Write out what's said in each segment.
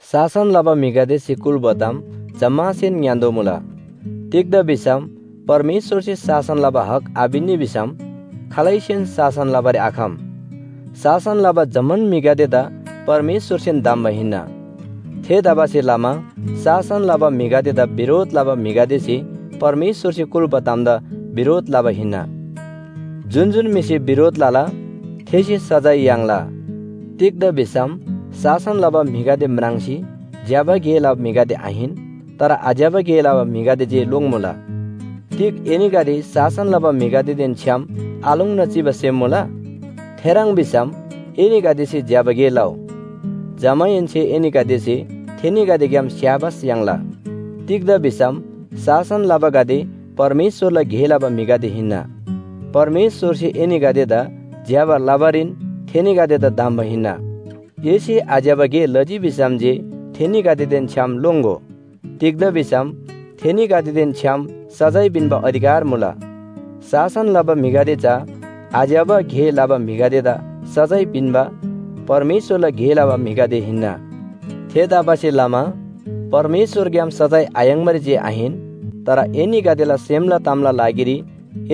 शासन लबा म्‍हिगदेसे कुल्‍बा ताम जम्‍मासेन ङ्‌यान्‍तोःमुला। तिग्‍दा भिसम परमेश्‍वरसे शासन लबा हक आपिन्‍नी भिसम खालैसेन शासन लबारी आखम। शासन लबा जम्‍मान म्‍हिगदेदा परमेश्‍वरसेन धम्‍बा हिन्‍ना। थेतबासेलमा शासन लबा म्‍हिगदेदा बिरोध लबा म्‍हिगदेसे परमेश्‍वरसे कुल्‍बा तामदा बिरोध लबा हिन्‍ना। जुन जुन म्‍हिसे बिरोध लला, थेसे सजाय याङ्ला। तिग्‍दा भिसम शासन लबा म्‍हिगदे म्राङ्सी ज्‍यबा गे लबा म्‍हिगदे आहिन, तर आज्‍यबा गे लबा म्‍हिगदे जे लोङ्‌मुला। तिग एनीगदे शासन लबा म्‍हिगदेदेन छ्‌याम आलोङ्ना चिबा सेम मुला? थेह्रङ् भिसम एनीगदेसे ज्‍यबा गे लउ। जमाहेन्‍से एनीगदेसे थेनीगदेग्‍याम स्‍याबास याङ्ला। तिग्‍दा भिसम शासन लबागदे परमेश्‍वरला गे लबा म्‍हिगदे हिन्‍ना। परमेश्‍वरसे एनीगदेदा ज्‍यबा लबारीन थेनीगदेदा धम्‍बा हिन्‍ना। एसे आज्‍यबा गे लजी भिसम जे थेनीगदेदेन छ्‌याम लोङ्‍गो। तिग्‍दा भिसम थेनीगदेदेन छ्‌याम सजाय पिन्‍बा अधिकार मुला। शासन लबा म्‍हिगदे चा आज्‍यबा गे लबा म्‍हिगदेदा सजाय पिन्‍बा परमेश्‍वरला गे लबा म्‍हिगदे हिन्‍ना। थेतबासेलमा परमेश्‍वरग्‍याम सजाय आयाङ्बारी जे आहिन, तर एनीगदेला सेमला तामला लागिरी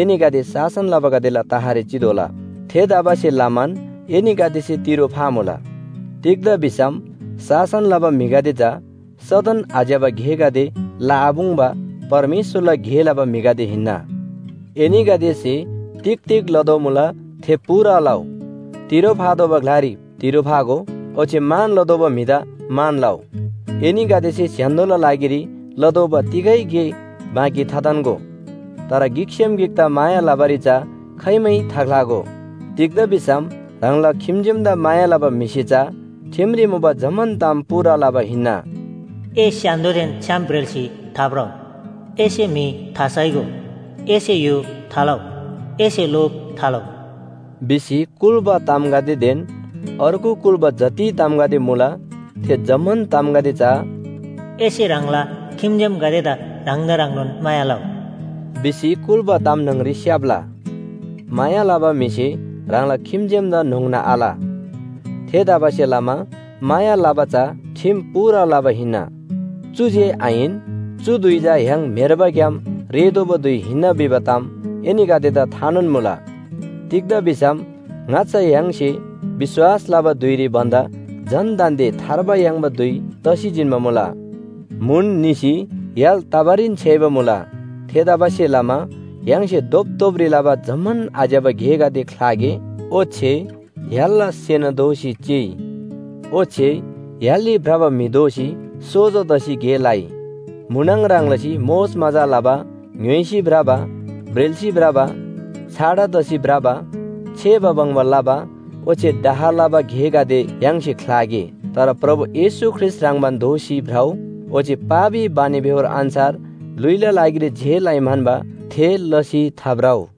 एनीगदे शासन लबागदेला तहरी चितोःला। थेतबासेलमान एनीगदेसे तिरो फामुला। तिग्‍दा भिसम शासन लबा म्‍हिगदे चा सदन आज्‍यबा गेगदे लआपुङ्बा परमेश्‍वरला गे लबा म्‍हिगदे हिन्‍ना। एनीगदेसे तिग तिग लदोमुला थे पूरा लउ, तिरो फातोःबा ग्‍लारी तिरो फागो ओच्‍छे मान लतोःबा म्‍हिदा मान लउ। एनीगदेसे स्‍य्‍हान्‍दोला लागिरी लतोःबा तिगै गे बाँकी थाथान्‍गो, तर गिकसेम गिकदा माया लबारी चा खाइमै थाख्‍लागो। तिग्‍दा भिसम ह्राङला खिम्‍जेमदा माया लबा म्‍हिसे चा ठिमरी मुबा जम्‍मान ताम पूरा लबा हिन्‍ना। “ए स्‍य्‍हान्‍दोदेन छ्‌याम ब्रेल्‍सी थाभ्रउ, एसे म्‍हि थासाइगो, एसे य्‍हो थालउ, एसे लोभ थालउ,” भिसी कुल्‍बा तामगदेदेन अर्गु कुल्‍बा जति तामगदे मुला थे जम्‍मान तामगदे चा “एसे ह्राङला खिम्‍जेमगदेदा ह्राङदा ह्रङ्नोन माया लउ” भिसी कुल्‍बा ताम न्‍हङरी स्‍याप्‍ला। माया लबा म्‍हिसे ह्राङला खिम्‍जेमदा न्‍होङ्ना आल। थेतबासेलमा माया लबा चा ठिम पूरा लबा हिन्‍ना। चु जे आहिन, चु धुइ चा य्‍हाङ म्‍हेर्बाग्‍याम रेःतोःबा धुइ हिन्‍ना भिबा ताम एनीगदेदा थानोन मुला। तिग्‍दा भिसम ङाच्‍छा य्‍हाङसे विश्‍वास लबा धुइरी भन्‍दा झन दान्‍दे थार्बा याङ्बा धुइ तसी जिन्‍बा मुला। म्‍हुन निसी य्‍हाल तबारीन छ्‌याइबा मुला। थेतबासेलमा य्‍हाङसे धोपधोपरी लबा जम्‍मान आज्‍यबा गेगदे ख्‍लागे, ओच्‍छे य्‍हालला सेना दोसी चिइ। ओच्‍छे य्‍हालरी भ्रबा म्‍हि दोसी सोजो तसी गे लइ। म्‍हुनङ ह्रङ् लसी मोजमजा लबा, ङ्‌य्‍होइसी भ्रबा, ब्रेल्‍सी भ्रबा, छाडा तसी भ्रबा, छेबा बङ्बा लबा, ओच्‍छे डाह लबा गेगदे य्‍हाङसे ख्‍लागे। तर प्रभु येशू ख्रीष्‍ट ह्रङ्‌बान दोसी भ्रउ, ओच्‍छे पापी बानीबेहोर अन्‍छार ल्‍हुइला लागिरी जे लइ म्‍हन्‍बा थे लसी थाभ्रउ।